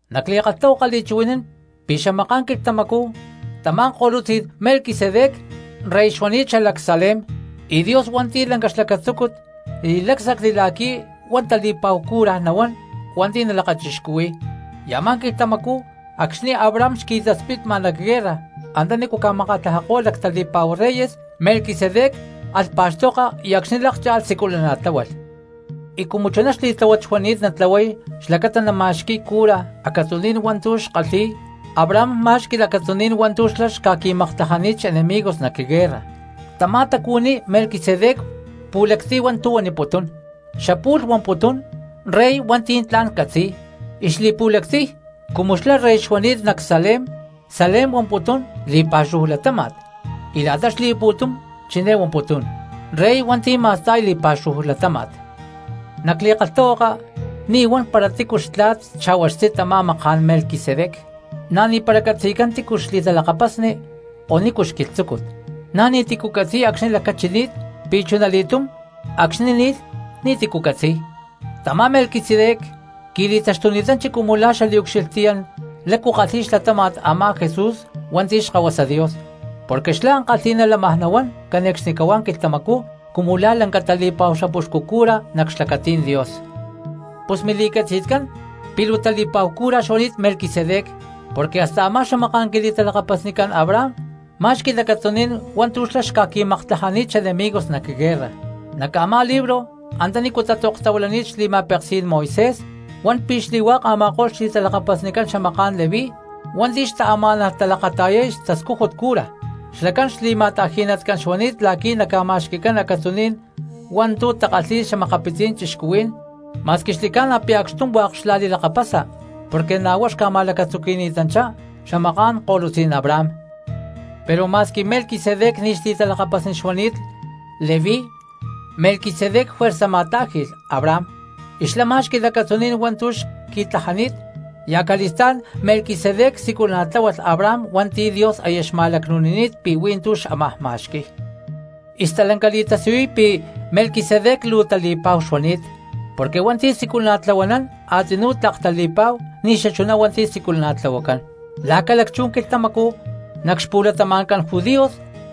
Nac li̠kalhtahuaka li̠chuhui̠nán pi̠ xamaká̠n quilhtamacú tamá ko̠lutzí̠n Melquisedec rey xuani̠t xalac Salem, y Dios hua̠nti̠ lanca xlacatzúcut li̠lácsacli la̠qui̠ huá tali̠pa̠hu cura nahuán hua̠nti̠ nalakachixcuhui̠y. Y a̠má quilhtamacú acxni̠ Abraham xqui̠taspitma nac guerra antanícu ca̠makatlajako̠lh lactali̠pa̠hu reyes Melquisedec alh pa̠xtoka y acxni̠ lákcha̠lh siculana̠tláhualh. Y cumu chuná xli̠tláhuat xuani̠t natlahuay xlacata nama̠xqui̠y cura acatzuní̠n hua̠ntu̠ xkalhi̠y, Abraham má̠xqui̠lh acatzuní̠n hua̠ntu̠ xlá xca̠qui̠maktlajani̠t xenemigos nac guerra. Tamá tacuhuiní Melquisedec pu̠lactiy hua̠ntu̠ huaniputún, xapu̠lh huamputún “rey hua̠nti̠ tla̠n catzi̠y”, y xli̠pu̠lactiy cumu xlá rey xuani̠t nac Salem, Salem huamputún “li̠pa̠xúhu latáma̠t”, y la̠ta xli̠pu̠tum chiné huamputún: “rey hua̠nti̠ ma̠sta̠y li̠pa̠xúhu latáma̠t”. Nac li̠kalhtahuaka ni̠ huan para tícu xtla̠t xa̠hua xtzí tamá maká̠n Melquisedec, na̠ ni̠para catzi̠cán tícu xli̠talakapasni o nícu xquilhtzúcut; na̠ ni̠ti̠cu catzi̠y acxni̠ lacachini̠t, pi̠ chunali̠túm acxni̠ ni̠lh ni̠ti̠cu catzi̠y. Tamá Melquisedec qui̠li̠taxtuni̠tanchi cumu la̠ xaliucxilhtiyán lácu kalhi̠y xlatáma̠t a̠má Jesús hua̠nti̠ Xkahuasa Dios, porque xlá ankalhi̠ná lámaj nahuán cane̠cxnicahuá quilhtamacú cumu la̠ lanca tali̠pa̠hu xapuxcu cura nac xlacatí̠n Dios. Pus mili̠catzi̠tcán pi̠ luu tali̠pa̠hu cura xuani̠t Melquisedec porque hasta a̠má xamaká̠n quili̠talakapasnicán Abraham má̠xqui̠lh acatzuní̠n hua̠ntu̠ xlá xca̠qui̠maktlajani̠t xenemigos nac guerra. Nac a̠má libro antanícu tatzoktahuilani̠t xli̠ma̠peksí̠n Moisés huan pi̠ xli̠hua̠k a̠ma̠ko̠lh xli̠talakapasnicán xamaká̠n Leví hua̠nti̠ xtaamá̠nalh talakata̠yay xtascújut cura, xlacán xli̠ma̠ta̠ji̠tcán xuani̠t la̠qui̠ naca̠ma̠xqui̠cán acatzuní̠n hua̠ntu̠ takalhi̠y xa̠makapitzí̠n cristianos, ma̠squi xli̠ca̠na pi̠ acxtum hua̠k xla̠li̠lakapasa porque na̠ huá xca̠ma̠lacatzuqui̠ni̠tanchá xamaká̠n ko̠lutzí̠n Abraham. Pero ma̠squi Melquisedec ni̠ xli̠talakapasni xuani̠t Leví Melquisedec juerza ma̠tá̠ji̠lh Abraham, y xlá má̠xqui̠lh acatzuní̠n hua̠ntu̠ xqui̠tlajani̠t, y acali̠stá̠n Melquisedec siculana̠tláhualh Abraham hua̠nti̠ Dios aya xma̠lacnu̠nini̠t pi̠ hui̠ntú xámaj ma̠xqui̠y. Y stalanca li̠tasiyuy pi̠ Melquisedec luu tali̠pa̠hu xuani̠t, porque hua̠nti̠ siculana̠tlahuanán a̠tzinú tlak tali̠pa̠hu ni̠ xachuná hua̠nti̠ siculana̠tlahuacán. Lá ca̠lacchú quilhtamacú nac xpu̠latama̠ncán judíos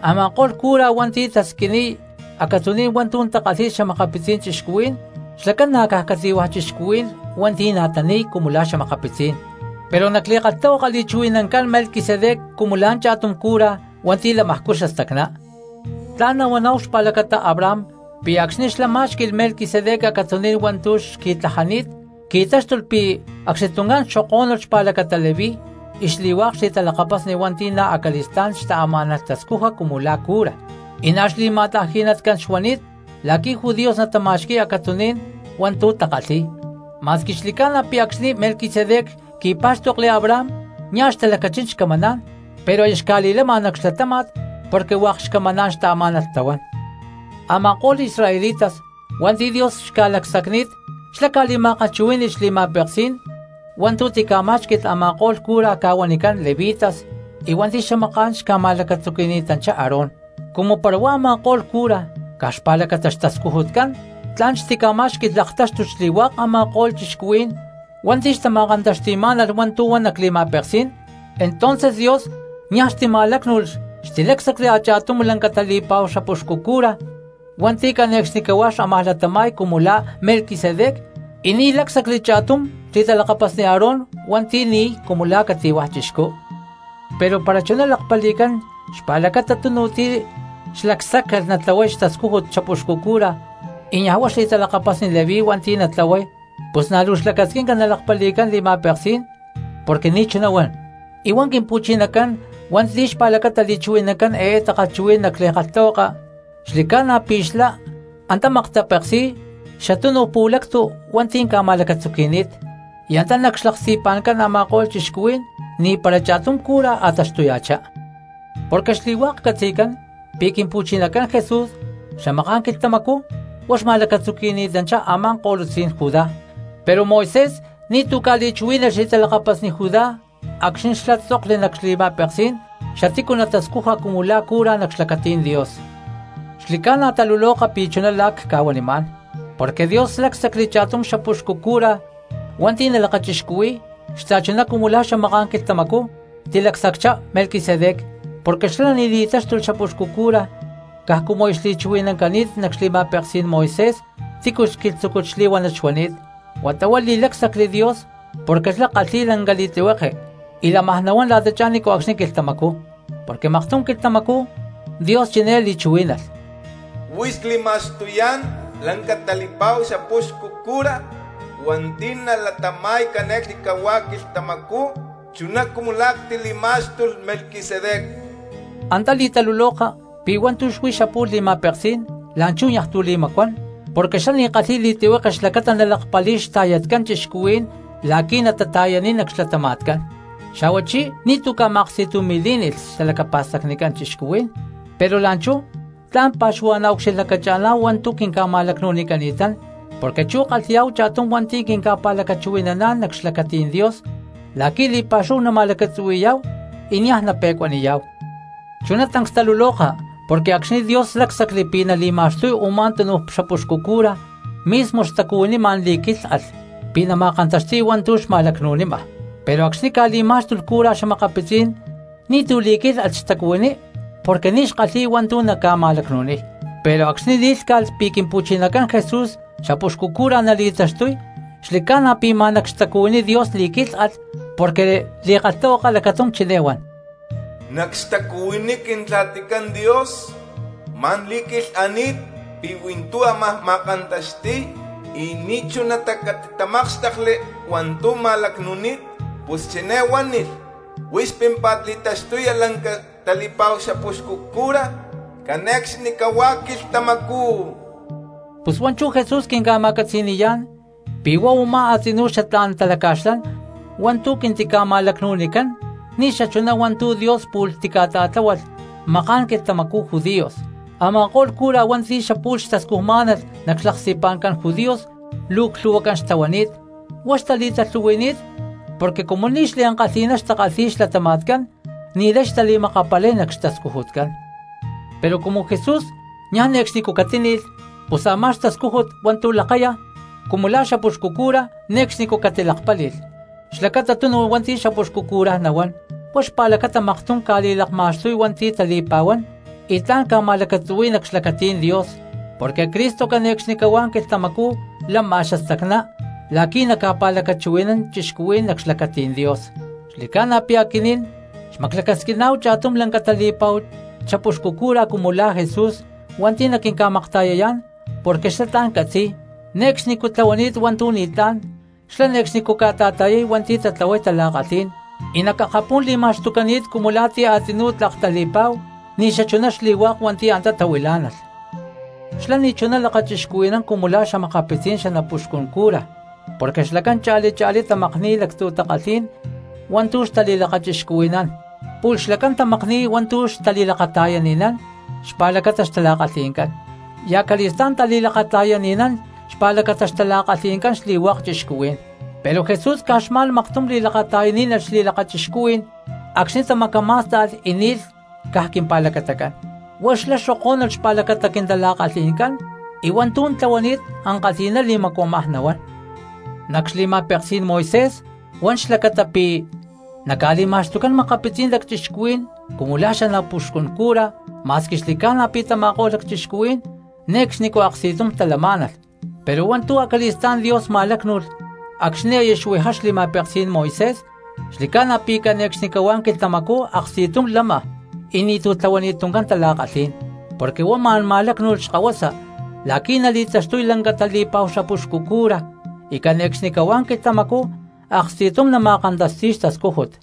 a̠ma̠ko̠lh cura hua̠nti̠ tasquiniy acatzuní̠n hua̠ntu̠ takalhi̠y xa̠makapitzí̠n cristianos xlacán ná caj cati̠hua̠ cristianos hua̠nti̠ na̠ tani̠y cumu la̠ xa̠makapitzí̠n; pero nac li̠kalhtahuaka li̠chuhui̠nancán Melquisedec cumu la̠ cha̠tum cura hua̠nti̠ lamajcú xastacná. Tla̠n nahuaná̠hu xpa̠lacata Abraham pi̠ acxni̠ xlá má̠xqui̠lh Melquisedec acatzuní̠n hua̠ntu̠ xqui̠tlajani̠t qui̠táxtulh pi̠ acxni tuncán xokó̠nulh xpa̠lacata Leví y xli̠hua̠k xli̠talakapasni hua̠nti̠ na̠ acali̠stá̠n xtaamá̠nalh tascuja cumu la̠ cura, y na̠ xli̠ma̠ta̠ji̠natcán xtahuani̠t la̠qui̠ judíos natama̠xqui̠y acatzuní̠n hua̠ntu̠ takalhi̠y. Ma̠squi xli̠ca̠na pi̠ acxni̠ Melquisedec qui̠pá̠xtokli Abraham nia̠ xtalacachín xcamaná̠n, pero aya xca̠li̠lama nac xlatáma̠t porque hua̠k xcamaná̠n xtaamá̠nalh tahuán. Ama̠ko̠lh cristianos israelitas hua̠nti̠ Dios xca̠lacsacni̠t xlá ca̠ma̠kalhchuhuí̠ni̠lh xli̠ma̠peksí̠n hua̠ntu̠ tica̠má̠xqui̠lh a̠ma̠ko̠lh cura ca̠huanicán levitas hua̠nti̠ xamaká̠n xca̠ma̠lacatzuqui̠ni̠tanchá Aarón; cumu para a̠ma̠ko̠lh cura caj xpa̠lacata xtascujutcán tla̠n xtica̠má̠xqui̠lh laktáxtut xli̠hua̠k a̠ma̠ko̠lh cristianos hua̠nti̠ xtama̠kantaxti̠má̠nalh hua̠ntu̠ huan nac li̠ma̠peksí̠n, entonces Dios niaj xtima̠lácnu̠lh xtilácsacli a̠cha̠tum lanca tali̠pa̠hu xapuxcu cura hua̠nti̠ cane̠cxnicahuá xámaj latama̠y cumu la̠ Melquisedec, y ni̠ lácsacli cha̠tum xli̠talakapasni Aarón hua̠nti̠ ni̠y cumu la̠ cati̠hua̠ chixcú. Pero para chuná lakpali̠cán xpa̠lacata tunu ti̠ xlacsáccalh natlahuay xtascújut xapuxcu cura y niaj huá xli̠talakapasni Leví hua̠nti̠ natlahuay, pus na̠ luu xlacasquinca nalakpali̠cán li̠ma̠peksi̠n porque ni̠ chuná huan. Y huá Quimpu̠chinacán, hua̠nti̠ xpa̠lacata li̠chuhui̠nancán eé takalhchuhuí̠n nac li̠kalhtahuaka, xli̠ca̠na pi̠ xlá antá maktapeksi̠y xa̠túnuj pu̠lactu hua̠nti̠ ca̠ma̠lacatzuqui̠ni̠t, y antá nac xlaksti̠pa̠ncán a̠ma̠ko̠lh cristianos ni̠para cha̠tum cura a̠ taxtuya̠chá. Porque xli̠hua̠k catzi̠cán pi̠ Quimpu̠chinacán Jesús xamaká̠n quilhtamacú huá xma̠lacatzuqui̠ni̠tanchá a̠má ko̠lutzí̠n Judá, pero Moisés ni̠tu̠ ca̠li̠chuhuí̠nalh xli̠talakapasni Judá acxni̠ xlá tzokli nac xli̠ma̠peksí̠n xatícu natascuja cumu la̠ cura nac xlacatí̠n Dios. Xli̠ca̠na taluloka pi̠ chuná la̠ cca̠huanimá̠n, porque Dios lácsacli cha̠tum xapuxcu cura hua̠nti̠ nalakachixcuhui̠y xta̠chuná cumu la̠ xamaká̠n quilhtamacú tilacsacchá Melquisedec. Porque xlá ni̠ titáxtulh xapuxcu cura caj cumu aya xli̠chuhui̠nancani̠t nac xli̠ma̠peksí̠n Moisés tícu xquilhtzúcut xli̠huánat xuani̠t, huata huá li̠lácsacli Dios porque xlá kalhi̠y lanca li̠tlihueke y lámaj nahuán la̠tachá ni̠nco̠cxni quilhtamacú. Porque maktum quilhtamacú Dios chiné li̠chuhuí̠nalh: Huix cli̠ma̠xtuyá̠n lanca tali̠pa̠hu xapúxcu cura hua̠nti̠ nalatama̠y cane̠cxnicahuá quilhtamacú chuná cumu la̠ ctili̠má̠xtulh Melquisedec. Antá li̠taluloka pi̠ hua̠ntu̠ xuí xapu̠lh li̠ma̠peksí̠n, la̠nchú niaj tu̠ li̠macuán porque xlá ni̠ xkalhi̠y li̠tlihueke xlacata nalakpali̠y quinta̠yatcán cristianos la̠qui̠ natata̠yaniy nac xlatama̠tcán, xa̠huachí ni̠tu̠cu ca̠ma̠aksti̠tumi̠lí̠ni̠lh xtalacapa̠stacnicán cristianos. Pero la̠nchú tla̠n pa̠xuhua̠na̠ ucxilhlacacha̠ná̠hu hua̠ntu̠ quinca̠ma̠lacnu̠nicani̠tán porque chú kalhi̠yá̠hu cha̠tum hua̠nti̠ quinca̠pa̠lacachuhui̠naná̠n nac xlacatí̠n Dios la̠qui̠ li̠pa̠xúhu nama̠lacatzuhui̠yá̠hu y niaj nape̠cuaniyá̠hu. Chuná tancs taluloka porque acxni̠ Dios lácsacli pi̠ nali̠ma̠xtuy u̠má tunu xapuxcu cura mismo xtacuhuiní ma̠n li̠quílhalh pi̠ nama̠kantaxti̠y hua̠ntu̠ xma̠lacnu̠nima, pero acxni̠ ca̠li̠má̠xtulh cura xa̠makapitzí̠n ni̠tu̠ li̠quilhani̠t xtacuhuiní porque ní xkalhi̠y hua̠ntu̠ naca̠ma̠lacnu̠niy. Pero acxni̠ li̠lhcá̠calh pi̠ Quimpu̠chinacán Jesús xapuxcu cura nali̠taxtuy xli̠ca̠na pi̠ ma̠n nac xtacuhuiní Dios li̠quílhalh, porque li̠kalhtahuaka lacatum chiné huan: Nac xtacuhuiní Quintla̠ticán Dios ma̠n li̠quilhani̠t pi̠ hui̠ntú ámaj ma̠kantaxti̠y y ni̠chunatá catitamákxtekli hua̠ntu̠ ma̠lacnu̠ni̠t. Pus chiné huánilh: “Huix pímpa̠t li̠taxtuya lanca tali̠pa̠hu xapuxcu cura cane̠cxnicahuá quilhtamacú.” Pus hua̠nchú Jesús quinca̠ma̠catzi̠ni̠yá̠n pi̠ huá u̠má a̠tzinú xatlá̠n talaca̠xlán hua̠ntu̠ quintica̠ma̠lacnu̠nicán ni̠ xachuná hua̠ntu̠ Dios pu̠lh tica̠ta̠tláhualh maká̠n quilhtamacú judíos. Ama̠ko̠lh cura hua̠nti̠ xapu̠lh xtascujmá̠nalh nac xlaksti̠pa̠ncán judíos luu clhu̠huacán xtahuani̠t, huá xtali̠talhu̠hui̠ni̠t porque cumu ni̠ xliankalhi̠ná xtakalhi̠y xlatama̠tcán ni̠lay xtali̠makapalay nac xtascujutcán. Pero cumu Jesús niaj ne̠cxnicú catíni̠lh pus a̠má xtascújut hua̠ntu̠ lakáya cumu la̠ xapuxcu cura ne̠cxnicú catilakpáli̠lh xlacata tunu hua̠nti̠ xapuxcu cura nahuán. Huá xpa̠lacata maktum ca̠li̠lakma̠xtuy hua̠nti̠ tali̠pa̠huán y tla̠n ca̠ma̠lacatzuhui̠y nac xlacatí̠n Dios, porque Cristo cane̠cxnicahuá quilhtamacú lama xastacná la̠qui̠ naca̠pa̠lacachuhui̠nán cristianos nac xlacatí̠n Dios. Xli̠ca̠na pi̠ aquinín xmaclacasquiná̠hu cha̠tum lanca tali̠pa̠hu xapuxcu cura cumu la̠ Jesús hua̠nti̠ naquinca̠makta̠yayá̠n, porque xlá tla̠n catzi̠y, ne̠cxnicú tlahuani̠t hua̠ntu̠ ni̠tlá̠n, xlá ne̠cxnicú ca̠ta̠ta̠yay hua̠nti̠ tatlahuay tala̠kalhí̠n, y nac akapú̠n li̠ma̠xtucani̠t cumu la̠ ti̠ a̠tzinú tlak tali̠pa̠hu ni̠ xachuná xli̠hua̠k hua̠nti̠ antá tahuilá̠nalh. Xlá ni̠chuná lakachixcuhui̠nán cumu la̠ xa̠makapitzí̠n xanapuxcun cura porque xlacán cha̠li cha̠lí tamakni̠y lactzu̠ takalhí̠n hua̠ntu̠ xtali̠lakachixcuhui̠nán, pu̠lh xlacán tamakni̠y hua̠ntu̠ xtali̠lakata̠yani̠nán xpa̠lacata xtala̠kalhi̠ncán, y acali̠stá̠n tali̠lakata̠yani̠nán xpa̠lacata xtala̠kalhi̠ncán xli̠hua̠k cristianos. Pero Jesús caj xma̠n maktum li̠lakata̠yaní̠nalh xli̠lakachixcuhuí̠n acxni̠ tamacamá̠sta̠lh y ni̠lh caj quimpa̠lacatacán, huá xlá xokó̠nulh xpa̠lacata quintala̠kalhi̠ncán, y hua̠ntu̠ tlahuani̠t ankalhi̠ná li̠macuamaj nahuán. Nac xli̠ma̠peksí̠n Moisés huan xlacata pi̠ naca̠li̠ma̠xtucán makapitzí̠n lacchixcuhuí̠n cumu la̠ xanapuxcun cura ma̠squi xli̠ca̠na pi̠ tama̠ko̠lh lacchixcuhuí̠n ne̠cxnicú aksti̠tum talamá̠nalh. Pero hua̠ntu̠ acali̠stá̠n Dios ma̠lácnu̠lh acxni̠ aya xuijá xli̠ma̠peksí̠n Moisés xli̠ca̠na pi̠ cane̠cxnicahuá quilhtamacú aksti̠tum lama y ni̠tu̠ tlahuani̠t tuncán tala̠kalhí̠n, porque huá ma̠n ma̠lácnu̠lh xkahuasa la̠qui̠ nali̠taxtuy lanca tali̠pa̠hu xapuxcu cura y cane̠cxnicahuá quilhtamacú aksti̠tum nama̠kantaxti̠y xtascújut.